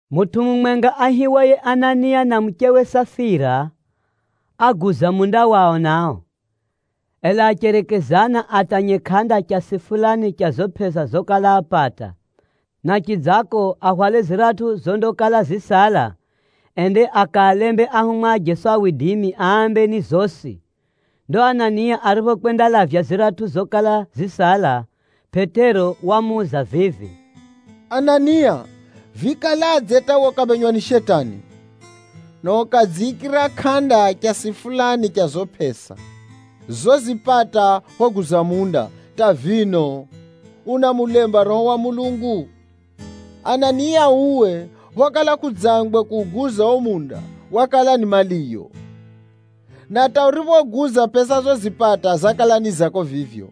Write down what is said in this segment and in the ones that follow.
Mutʼu mumwenga aihiwaye Anania na muchewe Safira, águza munda wao nao. Ela acherekezana atanye kʼanda chasi fulani cha zo pʼesa zokala apata, na chidzako ahwale ziratʼu zondakala zisala, ende akaalembe ahumwa a Jeso ambe ni zosi. Ndo Anania ariphokwendalavya ziratʼu zokala zisala, Pʼetero wamuuza vivi, “Anania, vikaladze hata we ukaphenywa ni Shetani, na ukadziikira kʼanda chasi fulani cha zo pʼesa zozipata phoguza munda, hata vino unamulemba Roho wa Mulungu? Anania, uwe phokala kʼudzangwe kuuguza o munda, wakala ni maliyo. Na hata uriphouguza, pʼesa zozipata zakala ni zako vivyo,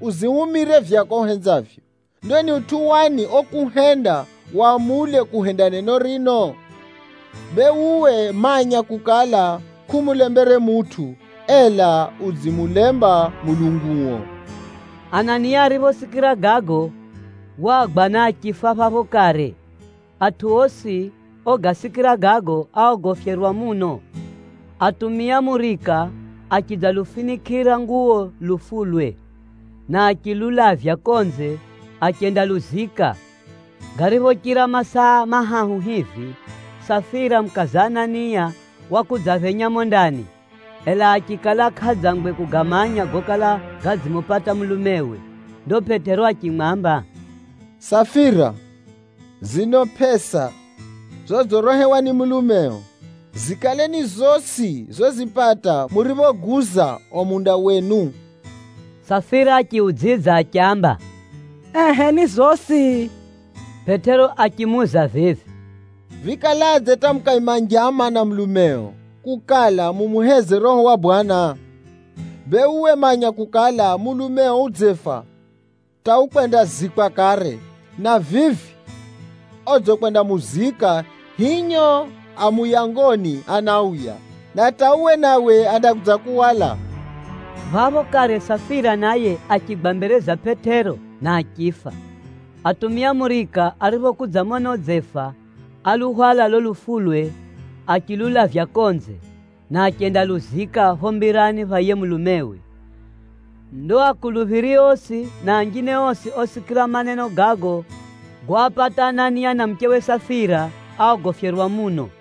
uzihumire vyako uhenzavyo! Ndo ni utʼu wani okuhenda wamule kuhenda neno rino? Bee uwe manya kukala, kʼumulembere mutʼu, ela udzimulemba Mulunguo!” Anania ariphosikira gago, wagwa na achifa phapho kare. Atʼu osi ogasikira gago, áogofyerwa muno. Atumia murika achidzalufinikʼira nguwo lufulwe, na achilulavya konze achendaluzika. Gariphochira masaa mahahu hivi, Safira mukaza Anania wakudzaphenya mumo ndani, ela achikala kʼadzangwe kugamanya gokala gadzimupata mulumewe. Ndo Pʼetero achimwamba, “Safira, zino pʼesa zodzirehewa ni mulumeo, zikale ni zosi zozipata muriphoguza o munda wenu?” Safira achiudzidza achiamba, “Ehʼe ni zosi.” Pʼetero achimuuza vivi, “Vikaladze hata mukaima njama na mulumeo kukala, mumuheze Roho wa Bwana? Bee uwe manya kukala, mulumeo udzefa hata ukwendazikwa kare. Na vivi odzikwendamuzika hinyo a muyangoni anauya, na hata uwe nawe andakudzakuhwala!” Phapho kare Safira naye achigwa mbere za Pʼetero, na achifa. Atumia murika ariphokudzamona udzefa, áluhwala lo lufulwe achilulavya konze, na achendaluzika pho mbirani pha yiye mulumewe. Ndo akuluphiri osi na anjine osi osikira maneno gago goapata Anania na muchewe Safira, áogofyerwa muno.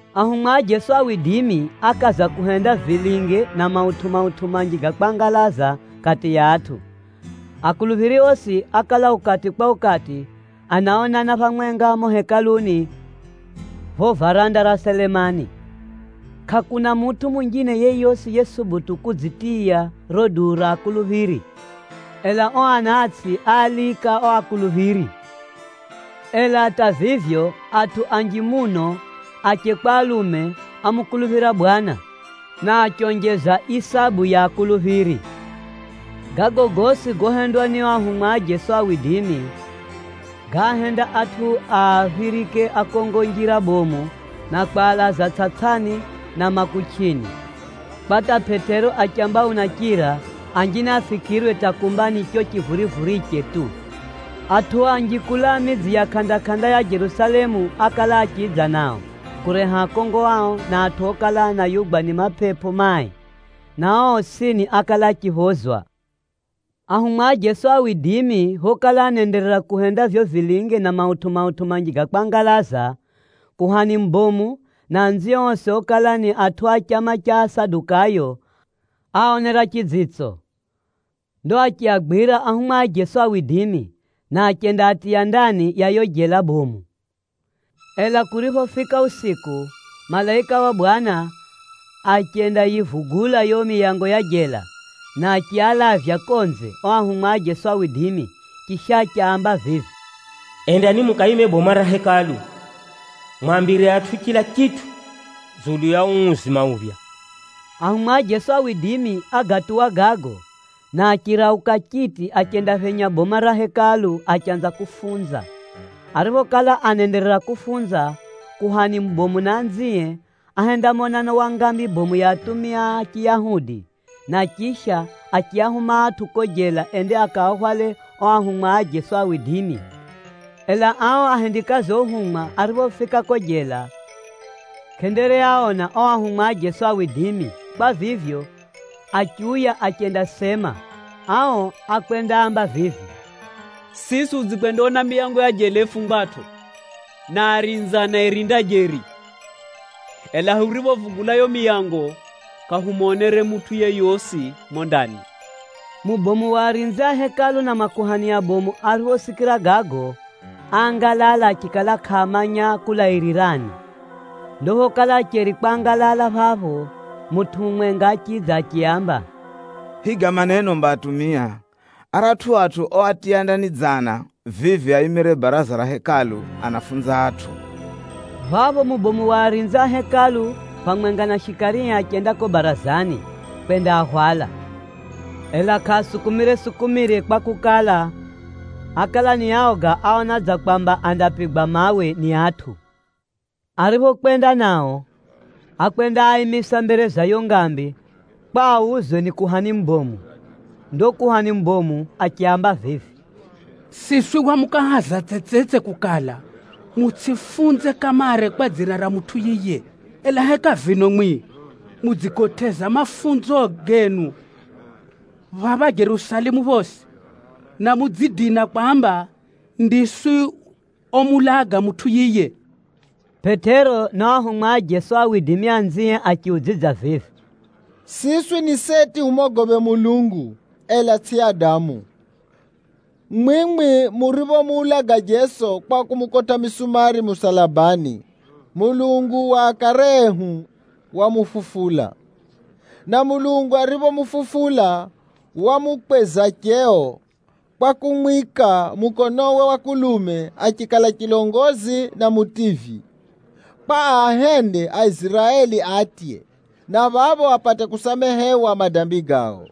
Ahumwa a Jeso ákaza kuhenda vilinge na mautʼu-mautʼu manji ga kwangalaza kati ya atʼu. Akuluphiri osi ákala ukati kwa ukati, anaonana phamwenga mumo Hekaluni pho varanda ra Selemani. Kʼakuna mutʼu munjine yeyosi yesubutu kudzitiya riro duu ra akuluphiri, ela o anatsʼi áalika o akuluphiri. Ela hata vivyo, atʼu anji muno, ache kwa alume ámukuluphira Bwana, na achionjeza isabu ya akuluphiri. Gago gosi gohendwa ni o ahumwa a Jeso, gáahenda atʼu aaphirike akongo njira bomu na kwalaza tsʼatsʼani na makuchʼini, kwa hata Pʼetero achiamba unachira, anjine afikirwe hata kumba ni cho chivurivuriche tu. Atʼu anji kulaa midzi ya kʼanda-kʼanda ya Jerusalemu ákala achidza nao, kureha akongo ao, na atʼu okala anayugwa ni mapepo mai, na ao osini ákala achiphozwa. Ahumwa a Jeso phokala anaenderera kuhenda vivyo vilinge na mautʼu-mautʼu manji ga kwangalaza, kuhani mubomu, na anzie osi okala ni atʼu a chama cha Asadukayo, áaonera chidzitso. Ndo achiagwira ahumwa a Jeso, na achendaatiya ndani ya yo jela bomu. Ela kuriphofika usiku, malaika wa Bwana achendayivugula yo miyango ya jela, na achialavya konze o ahumwa a Jeso. Chisha, achiaamba vivi, “Endani mukaime boma ra Hekalu, mwambire atʼu chila chitʼu dzulu ya uu uzima uphya.” Ahumwa a Jeso ágatuwa gago, na achirauka chiti achendaphenya boma ra Hekalu achanza kufunza. Ariphokala anaenderera kufunza, kuhani mubomu na anzie, áhenda monano wa ngambi bomu ya atumia a Chiyahudi, na chisha achiahuma atʼu ko jela ende akaahwale o ahumwa a Jeso. Ela ao ahendikazi ohumwa ariphofika ko jela, kʼendereaona o ahumwa a Jeso. Kwa vivyo, achiuya achendasema. Ao ákwendaamba vivi, “Siswi hudzikwendaona miyango ya jela yifungwatʼo, na arinzi anayirinda jeri. Ela huriphovugula yo miyango, kʼahumonere mutʼu yeyosi mumo ndani.” Mubomu wa arinzi a Hekalu na makuhani abomu ariphosikira gago, áangalala achikala kʼaamanya kulairirani. Ndo phokala acheri kwangalala phapho, mutʼu mumwenga achidza achiaamba, “Higa maneno mba atumia! Aratʼu atʼu oatiya ndani dzana, vivi aimire baraza ra Hekalu anaafunza atʼu.” Phapho mubomu wa arinzi a Hekalu, phamwenga na shikarie achenda ko barazani, kwendaahwala. Ela kʼaasukumire-sukumire kwakukala, ákala ni aoga áona dza kwamba andapigwa mawe ni atʼu. Ariphokwenda nao, ákwendaaimisa mbere za yo ngambi kwa auzwe ni kuhani mubomu. Ndo kuhani mubomu achiaamba vivi, “Siswi hwamukahaza tsetsetse kukala, mutsʼifunze kamare kwa dzina ra mutʼu yiye. Ela heka vino mwi mudzigotʼeza mafunzo genu phapha Jerusalemu phosi, na mudzidina kwamba ndiswi omuulaga mutʼu yiye?” Pʼetero na o ahumwa a Jeso anzie achiudzidza vivi, “Siswi ni seti humogophe Mulungu, ela tsʼi adamu. Mwimwi muriphomuulaga Jeso kwa kumukotʼa misumari musalabani, Mulungu wa akare ehu wamufufula. Na Mulungu ariphomufufula, wamukweza cheo, kwa kumwika mukonowe wa kulume achikala chilongozi na Mutivyi, kwa aahende Aiziraeli atye, na phapho apate kusamehewa madambi gao.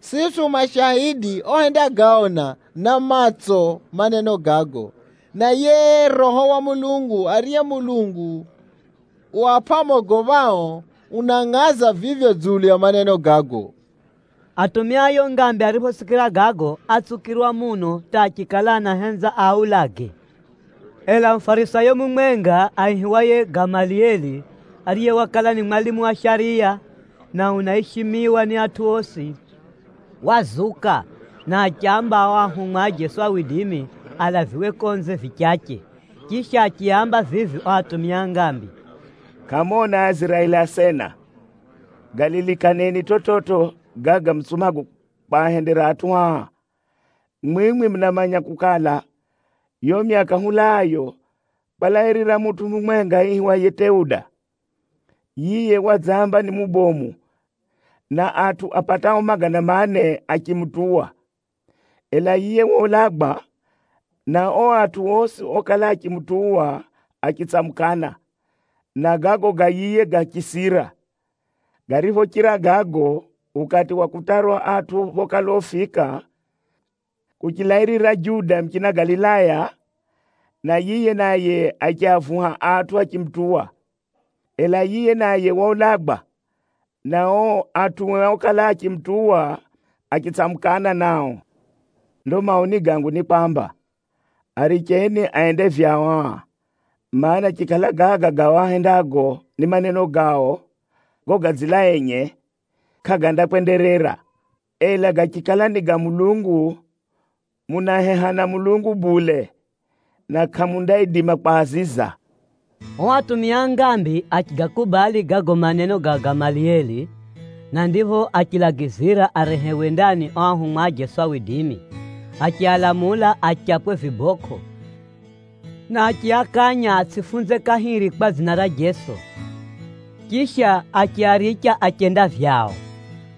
Siswi hu mashaidi ohendagaona na matso maneno gago, na yiye Roho wa Mulungu ariye Mulungu uapʼa amogophao, unangʼaza vivyo dzulu ya maneno gago.” Atumia a yo ngambi ariphosikira gago, átsukirwa muno hata achikala anahenza aaulage. Ela Mufarisayo mumwenga aihiwaye Gamalieli, ariye wakala ni mwalimu wa shariya na unaishimiwa ni atʼu osi, wazuka, na achiamba o ahumwa a Jeso alaviwe konze vichache. Chisha, achiaamba vivi o atumia a ngambi, “Kʼamona Aiziraeli asena, galilikaneni chividzo gaga mutsumago kwahendera atʼu aa! Mwimwi munamanya kukala, yo myaka hulaayo, kwalairira mutʼu mumwenga aihiwaye Teuda. Yiye wadzamba ni mubomu, na atʼu apatao magana mane achimutuwa. Ela yiye waulagwa, na o atʼu osi okala achimutuwa achitsamukana, na gago ga yiye gachisira. Gariphochira gago, ukati wa kutarwa atʼu phokala ufika, kuchilairira Juda muchina Galilaya, na yiye naye achiavuha atʼu achimutuwa. Ela yiye naye waulagwa, na o atʼue okala achimutuwa achitsamukana nao. Ndo maoni gangu ni kwamba, aricheni ende vyao aa, mana, chikala gaga gao agahendago ni maneno gao gogadzila enye, kʼagandakwenderera. Ela gachikala ni ga Mulungu, munaheha na Mulungu bule, na kʼamundaidima kwaziza!” Ao atumia a ngambi achigakubali gago maneno ga Gamalieli, na ndipho achialagizira arehewe ndani o ahumwa a Jeso. Achialamula achapwe vibokʼo, na achiakanya atsʼifunze kahiri kwa dzina ra Jeso, chisha achiaricha achenda vyao.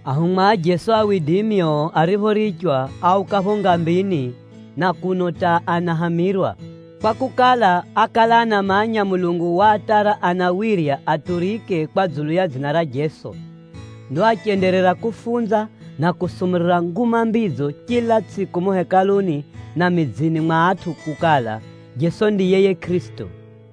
Ahumwa a Jeso o ariphorichwa, áuka pho ngambini na kuno hata anahamirwa, kwakukala, ákala anamanya Mulungu waatara anawirya aturike kwa dzulu ya dzina ra Jeso. Ndo achenderera kufunza na kusumurira Nguma Mbidzo chila tsʼiku mumo Hekaluni na midzini mwa atʼu kukala, Jeso ndiye yiye Kʼirisito.